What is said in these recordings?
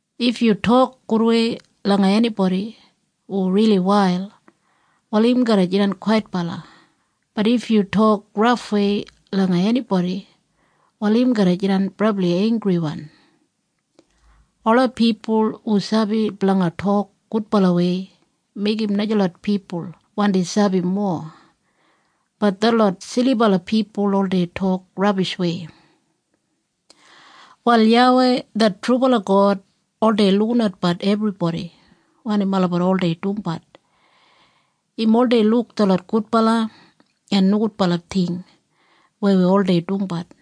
If yu tok gudwei langa enibodi hu rili wail, wal im garra jidan kwaitbala, bat if yu tok rafwei langa enibodi, wal im garra jidan brabli einggriwan. Ola pipul hu sabi blanga tok gudbalawei meigim najalot pipul wandi sabi mowa, bat detlot silibala pipul oldei tok rabishwei. Wal YAWEI det trubala God oldei lukinatbat ebribodi wanim olabat oldei dumbat. Im oldei luk detlot gudbala en nogudbala ting weya wi oldei dumbat.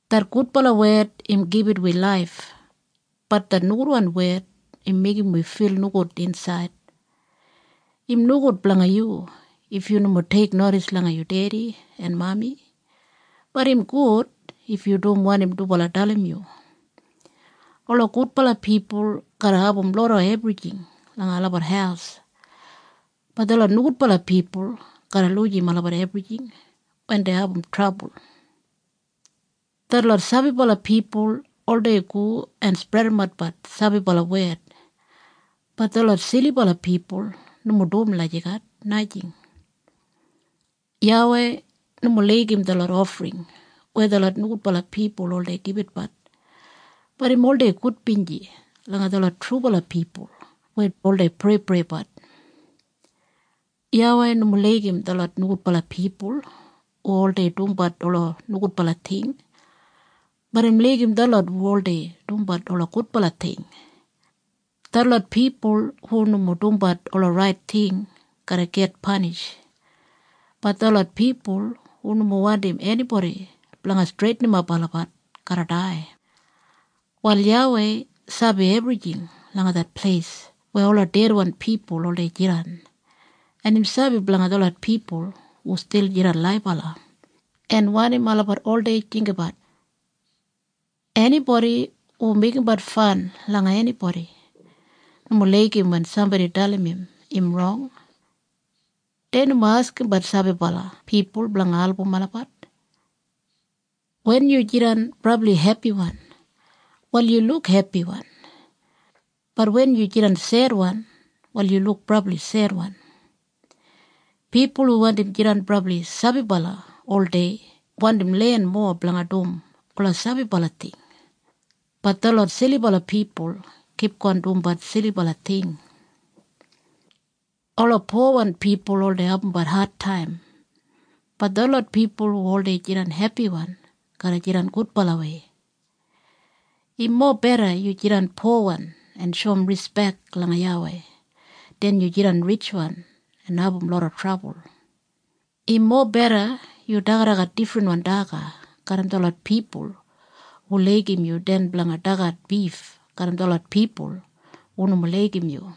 Det gudbala wed im gibit wi laif, bat det nogudwan wed im meigim wi fil nogud insaid. Im nogud blanga yu if yu nomo teiknodis langa yu dedi en mami, bat im gud if yu dum wanim dubala dalim yu. Ola gudbala pipul garra abum loda ebrijing langa olabat haus, bat detlot nogudbala pipul garra lujim olabat ebrijing wen dei abum trabul. Detlot sabibala pipul oldei go en spredimatbat sabibala wed, bat detlot silibala pipul nomo dum lagijat, najing. YAWEI nomo laigim detlot ofring weya detlot nogudbala pipul oldei gibitbat, bat im oldei gudbinji langa detlot trubala pipul weya oldei preipreibat. YAWEI nomo laigim detlot nogudbala pipul hu oldei dumbat ola nogudbala ting, bat im laigim detlot hu oldei dumbat ola gudbala ting. Detlot pipul hu nomo dumbat ola rait ting garra git panish, bat detlot pipul hu nomo wandim enibodi blanga streitinimap olabat garra dai. Wal YAWEI sabi ebrijing langa det pleis weya ola dedwan pipul oldei jidan en im sabi blanga detlot pipul hu stil jidan laibala, en wanim olabat oldei jinggabat. Enibodi hu meigimbat fan langa enibodi, nomo laigim wen sambodi dalim im, im rong. Dei nomo askimbat sabibala pipul blanga album olabat. Wen yu jidan brabli hepiwan, wal yu luk hepiwan, bat wen yu jidan sedwan, wal yu luk brabli sedwan. Pipul hu wandim jidan brabli sabibala oldei wandim len mowa blanga dum ola sabibala ting, bat detlot silibala pipul kipgon dumbat silibala ting. Ola powan pipul oldei abumbat adtaim, bat detlot pipul hu oldei jidan hepiwan garra jidan gudbalawei. Im mobeda yu jidan powan en shoum rispek langa YAWEI den yu jidan ritjwan en abum loda trabul. Im mobeda yu dagadagat difrinwan daga garram detlot pipul hu laigim yu den blanga dagat bif garram detlot pipul hu nomo laigim yu.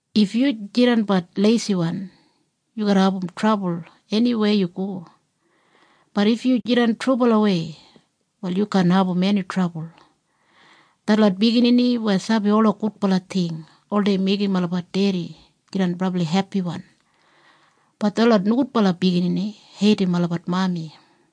If yu jidanbat leisiwan yu garra abum trabul eniweya yu go, bat if yu jidan trubalawei wal yu kaan abum eni trabul. Detlot biginini weya sabi ola gudbala ting oldei meigim olabat dedi jidan brabli hepiwan, bat detlot nogudbala biginini heidim olabat mami.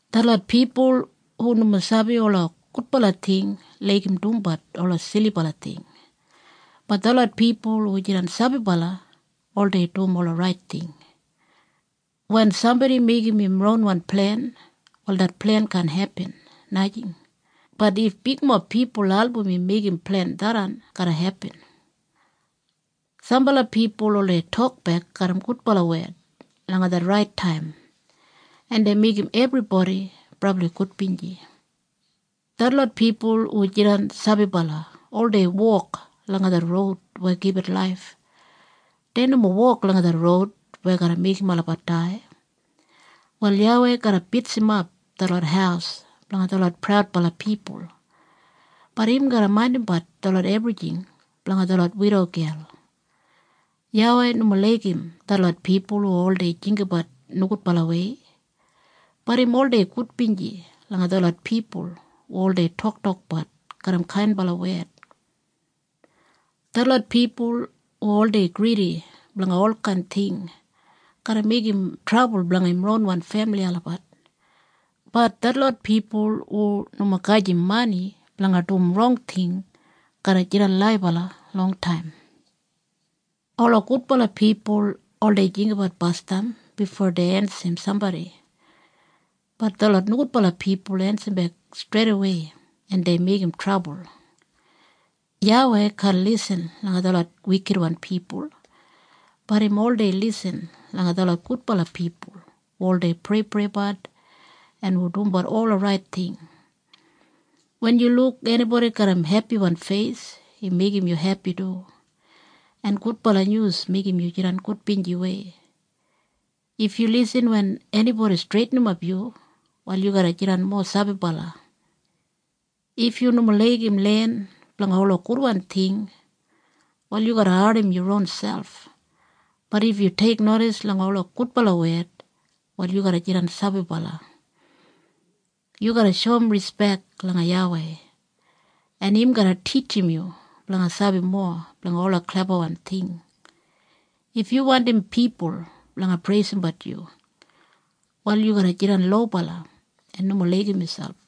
Detlot pipul hu nomo sabi ola gudbala ting laigim dumbat ola silibala ting, bat detlot pipul hu jidan sabibala oldei dum ola rait ting. Wen sambodi meigim im ronwan plen wal det plen kaan hepin, najing, bat if bigmob pipul album im meigim plen tharran garra hepin. Sambala pipul oldei tokbek garram gudbala wed langa det rait taim en dei meigim ebribodi brabli gudbinji. Detlot pipul hu jidan sabibala oldei wok langa det roud weya gibit laif. Dei nomo wok langa det roud weya garra meigim olabat dai. Wal YAWEI garra bitsimap detlot haus blanga detlot praudbala pipul, bat im garra maindimbat detlot ebrijing blanga detlot widogel. YAWEI nomo laigim detlot pipul hu oldei jinggabat nogudbalawei, bat im oldei gudbinji langa detlot pipul hu oldei toktokbat garram kainbala wed. Detlot pipul hu oldei gridi blanga olkain ting garra meigim trabul blanga im ronwan femili olabat, bat detlot pipul hu nomo gajim mani blanga dum rong ting garra jidan laibala longtaim. Ola gudbala pipul oldei jinggabat basdam bifo dei ensim sambodi, bat detlot nogudbala pipul ensimbek streidawei en dei meigim trabul. YAWEI kaan lisin langa detlot wikitwan pipul, bat im oldei lisin langa detlot gudbala pipul hu oldei preipreibat en hu dumbat ola rait ting. Wen yu luk enibodi garram hepiwan feis im meigim yu hepi du, en gudbala nyus meigim yu jidan gudbinjiwei. If yu lisin wen enibodi streitinimap yu, wal yu garra jidan mowa sabibala. If yu nomo laigim len blanga ola gudwan ting wal yu garra ardim yu ronselp, bat if yu teiknodis langa ola gudbala wed wal yu garra jidan sabibala. Yu garra shoum rispek langa YAWEI en im garra titjim yu blanga sabi mowa blanga ola klebawan ting. If yu wandim pipul blanga preisimbat yu, wal yu garra jidan lobala en nomo laigim miselp.